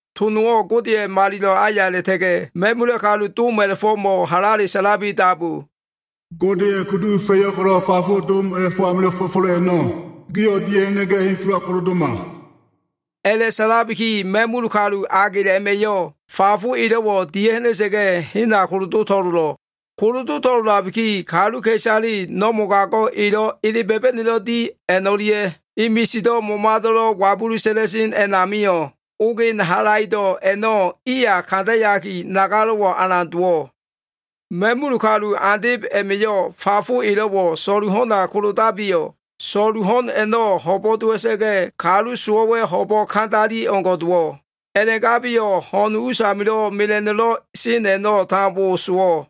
To nowo꞉ Godeya꞉ malilo꞉ aya a꞉la꞉ta꞉ga꞉ ma꞉mula꞉ kalu dom a꞉la꞉fo꞉mo꞉ halale sa꞉labiki dabu, “Godeya꞉ kulufa꞉yo꞉ ko꞉lo꞉ fafo dom a꞉la꞉fo꞉ amilo꞉ fo꞉fo꞉lo꞉ a꞉no꞉ gio꞉ dia꞉ha꞉na꞉ga꞉ henfelo꞉wa kolodoma.” A꞉la꞉sa꞉labiki ma꞉mul kalu agel a꞉ma꞉yo꞉ fafo elo꞉wo꞉ dia꞉ha꞉na꞉sa꞉ga꞉ hena kolodo to꞉lolo꞉. Kolodo꞉ to꞉lolabiki, kaluka꞉isale no꞉ mogago꞉ elo꞉ ele ba꞉ba꞉no꞉lo꞉ di a꞉no꞉lia꞉ e misido꞉ momado꞉lo꞉ wabulu sa꞉la꞉sen a꞉namio꞉ ogen halaido꞉ a꞉no꞉ iya kandayaki, nagalo꞉ alan dowo꞉. Ma꞉mul kalu andeb a꞉ma꞉yo꞉ fafo elo꞉wo꞉ so꞉lu ho꞉na kolodabiyo꞉, so꞉lu ho꞉n a꞉no꞉ ho꞉bo꞉ dowa꞉sa꞉ga꞉, kalu sowo꞉wa꞉ ho꞉bo꞉ ko꞉lo꞉ kandali o꞉ngo꞉ dowo꞉. A꞉la꞉gabiyo꞉ ho꞉na꞉ us amilo꞉ mela꞉no꞉lo꞉ sen a꞉no꞉ tambo sowo꞉.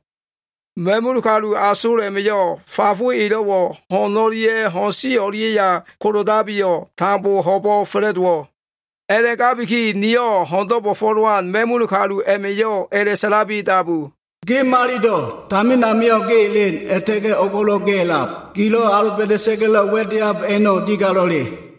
Ma꞉mul kalu asol a꞉ma꞉yo꞉ fafo elo꞉wo꞉ ho꞉n o꞉lia꞉ ho꞉n si o꞉lia꞉ya kolodabiyo꞉, tambo ho꞉bo꞉ fa꞉la꞉dowo꞉. A꞉la꞉gabiki niyo꞉ ho꞉ndo꞉ bo꞉fo꞉lowan ma꞉mul kalu a꞉ma꞉yo꞉ a꞉la꞉sa꞉labi dabu, “Ge Malilo꞉. Tamin amio꞉ ge elen a꞉la꞉ta꞉ga꞉ o꞉go꞉lo꞉ ge a꞉lab. Gilo꞉ aloba꞉da꞉sa꞉ga꞉lo꞉ wa꞉deab a꞉no꞉ digalo꞉le.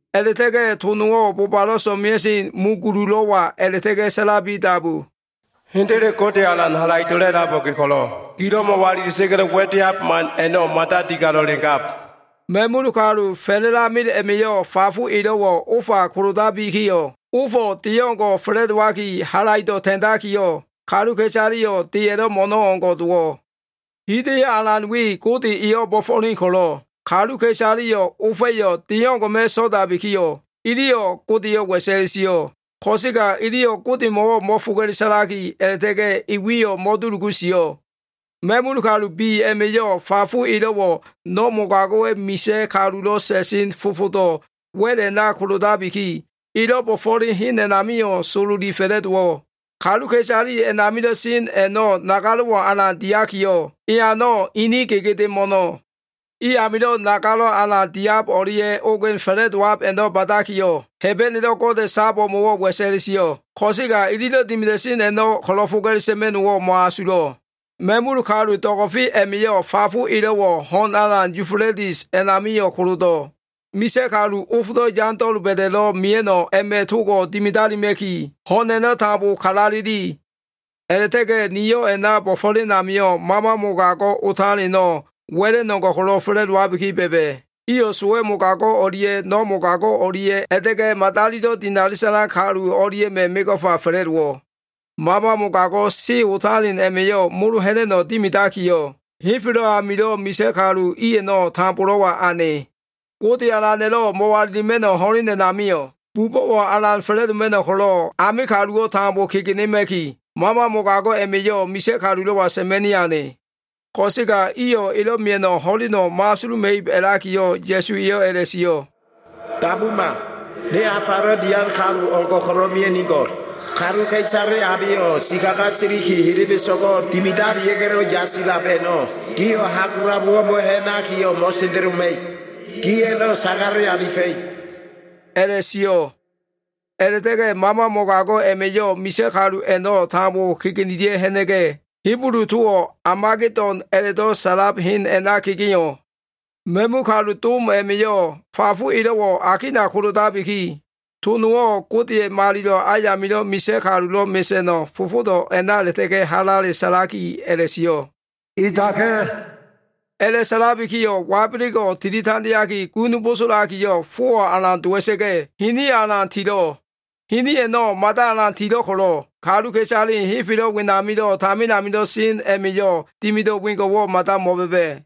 A꞉la꞉ta꞉ga꞉ to nowo꞉ bobalo꞉ so꞉mea꞉sen mu gululo꞉wa a꞉la꞉ta꞉ga꞉ sa꞉labi dabu. “Hendele, Gode Alan Halaido꞉lo꞉ a꞉labo꞉ ge ko꞉lo꞉, gilo꞉ mo꞉walila꞉sa꞉ga꞉lo꞉ wa꞉deab man a꞉no꞉ mada digalo꞉le gab.” Ma꞉mul kalu fa꞉la꞉lamel a꞉ma꞉yo꞉ fafo elo꞉wo꞉ ofa kolodabikiyo꞉, ofo꞉ de o꞉ngo꞉ fa꞉la꞉dowaki halaido꞉ ta꞉ndakiyo꞉, kaluka꞉isaleyo꞉ deya꞉lo꞉ mo꞉no꞉ o꞉ngo꞉ dowo꞉. Hida꞉yo꞉ alan we, Gode eyo꞉ bo꞉fo꞉len ko꞉lo꞉, kaluka꞉isaleyo꞉ ofa꞉yo꞉ de o꞉ngo꞉ma꞉ so꞉dabikiyo꞉, iliyo꞉ Godeyo꞉ wa꞉sa꞉le sio꞉. Ko꞉sega iliyo꞉ Godemo꞉wo꞉ mo꞉foga꞉le sa꞉laki, a꞉la꞉ta꞉ga꞉ e wiyo꞉ mo꞉dulugu sio꞉. Ma꞉mul kalu bi a꞉ma꞉yo꞉ fafo elo꞉wo꞉ no꞉ mogago꞉wa꞉ misa꞉ kalulo꞉ sa꞉sen fofodo꞉ wa꞉l a꞉na kolodabiki, elo꞉ bo꞉fo꞉len hen a꞉namio꞉ sololi fa꞉la꞉dowo꞉. Kaluka꞉isale a꞉namilo꞉ sen a꞉no꞉ nagalo꞉wo꞉ alan diakiyo꞉, eano꞉ inin gegede mo꞉no꞉. I amilo꞉ nagalo꞉ alan diab o꞉lia꞉ ogen fa꞉la꞉dowab a꞉no꞉ ba꞉dakiyo꞉, Hebenelo꞉ Gode sab o꞉mo꞉wo꞉ wa꞉sa꞉le sio꞉. Ko꞉sega ililo꞉ dimida꞉sen a꞉no꞉ ko꞉lo꞉ foga꞉le sa꞉ma꞉no꞉wo꞉ mo꞉asulo꞉. Ma꞉mula꞉ kalu do꞉go꞉fe a꞉ma꞉yo꞉ fafo elo꞉wo꞉ ho꞉n alan Yufuletis a꞉namio꞉ kolodo꞉. Misa꞉ kalu, ofdo꞉ yando꞉ doba꞉da꞉lo꞉ mia꞉no꞉wo꞉ a꞉ma꞉ togo꞉ dimidalima꞉ki, ho꞉n a꞉no꞉ tambo kalaleli. A꞉la꞉ta꞉ga꞉ niyo꞉ a꞉na bo꞉fo꞉len amio꞉ mama mogago꞉ otaleno꞉, wa꞉la꞉no꞉ o꞉ngo꞉ ko꞉lo꞉ fa꞉la꞉dowabi ba꞉ba꞉. Iyo꞉ sowa꞉ mogago꞉ o꞉lia꞉ no꞉ mogago꞉ o꞉lia꞉, a꞉la꞉ta꞉ga꞉ madalilo꞉ dinali sa꞉lan kalu o꞉lia꞉ma꞉ mego꞉fa fa꞉la꞉dowo꞉. Mama mogago꞉ se otalen a꞉ma꞉yo꞉ molo ha꞉na꞉no꞉ dimidakiyo꞉, henfelo꞉ amilo꞉ misa꞉ kalu i a꞉no꞉ tambolo꞉wa ane. Gode Alana꞉lo꞉ mo꞉walilima꞉no꞉ ho꞉len a꞉namio꞉, bubo꞉wo꞉ alan fa꞉la꞉doma꞉no꞉ ko꞉lo꞉, ame kaluwo꞉ tambo kegenema꞉ki, mama mogago꞉ a꞉ma꞉yo꞉ misa꞉ kalulo꞉wa sa꞉ma꞉ni ane. Ko꞉sega iyo꞉ elo꞉ mia꞉no꞉ ho꞉leno꞉ mo꞉asuluma꞉ib a꞉lakiyo꞉, Ya꞉su eyo꞉ a꞉la꞉sio꞉, “Dabuma! Ne afalo꞉ dian kalu o꞉ngo꞉ ko꞉lo꞉ mia꞉nigo꞉l. Kaluka꞉isale abeyo꞉ sikaga siliki, helebeso꞉go꞉ dimidalia꞉ga꞉lo꞉ yasilab a꞉no꞉ gio꞉ hagulabowo꞉ mo꞉ha꞉naki mo꞉sendeloma꞉ib. Gi a꞉no꞉ sagale alifa꞉ib” a꞉la꞉sio꞉. A꞉la꞉ta꞉ga꞉ mama mogago꞉ a꞉ma꞉yo꞉ misa꞉ kalu a꞉no꞉ tambo kegenelia꞉ ha꞉na꞉ga꞉, Hibulu towo꞉ Amagedon a꞉la꞉do꞉ sa꞉lab hen a꞉na kegeo꞉. Ma꞉mul kalu dom a꞉ma꞉yo꞉ fafo elo꞉wo꞉ akina kolodabiki, to nowo꞉ Godeya꞉ malilo꞉ ayamilo꞉ misa꞉ kalulo꞉ mesa꞉no꞉ fofodo꞉ a꞉na a꞉la꞉ta꞉ga꞉ halale sa꞉laki a꞉la꞉sio꞉, “Edaka꞉!” A꞉la꞉sa꞉labikiyo꞉ wabelego꞉ tili tandeaki, gun bosolakiyo꞉, fowo꞉ alan dowa꞉sa꞉ga꞉, hiniyo꞉ alan tilo꞉. Hini a꞉no꞉ mada alan tilo꞉ ko꞉lo꞉, kaluka꞉isale henfelo꞉ wenamilo꞉ tamin amilo꞉ sen a꞉ma꞉yo꞉ dimido꞉ wengo꞉wo꞉ mada mo꞉ba꞉ba꞉.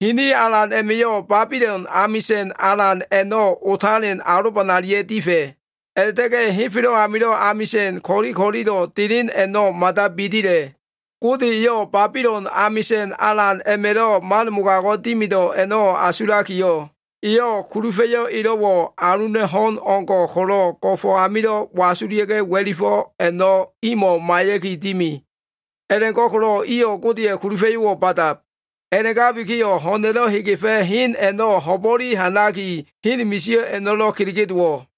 Hini alan a꞉ma꞉yo꞉ Babilon amisa꞉n alan a꞉no꞉ otalen alobanalia꞉ difa꞉. A꞉la꞉ta꞉ga꞉ henfelo꞉ amilo꞉ amisa꞉n ko꞉li ko꞉lilo꞉ delen a꞉no꞉ mada bidila꞉. Gode eyo꞉ Babilon amisa꞉n alan a꞉ma꞉lo꞉ man mogago꞉ dimido꞉ a꞉no꞉ asulakiyo꞉, eyo꞉ kulufa꞉yo꞉ elo꞉wo꞉ aluna꞉ ho꞉n o꞉ngo꞉ ko꞉lo꞉ go꞉fo꞉ amilo꞉ wasulia꞉ga꞉ wa꞉lifo꞉ a꞉no꞉ imo꞉ maiya꞉ki dimi. A꞉la꞉go꞉ko꞉lo꞉ iyo꞉ Godeya꞉ kulufa꞉yo꞉wo꞉ ba꞉dab. A꞉la꞉gabikiyo꞉ ho꞉na꞉lo꞉ hegefa꞉ hen a꞉no꞉ ho꞉bo꞉le ha꞉naki, hen misio꞉ a꞉no꞉lo꞉ kelege dowo꞉.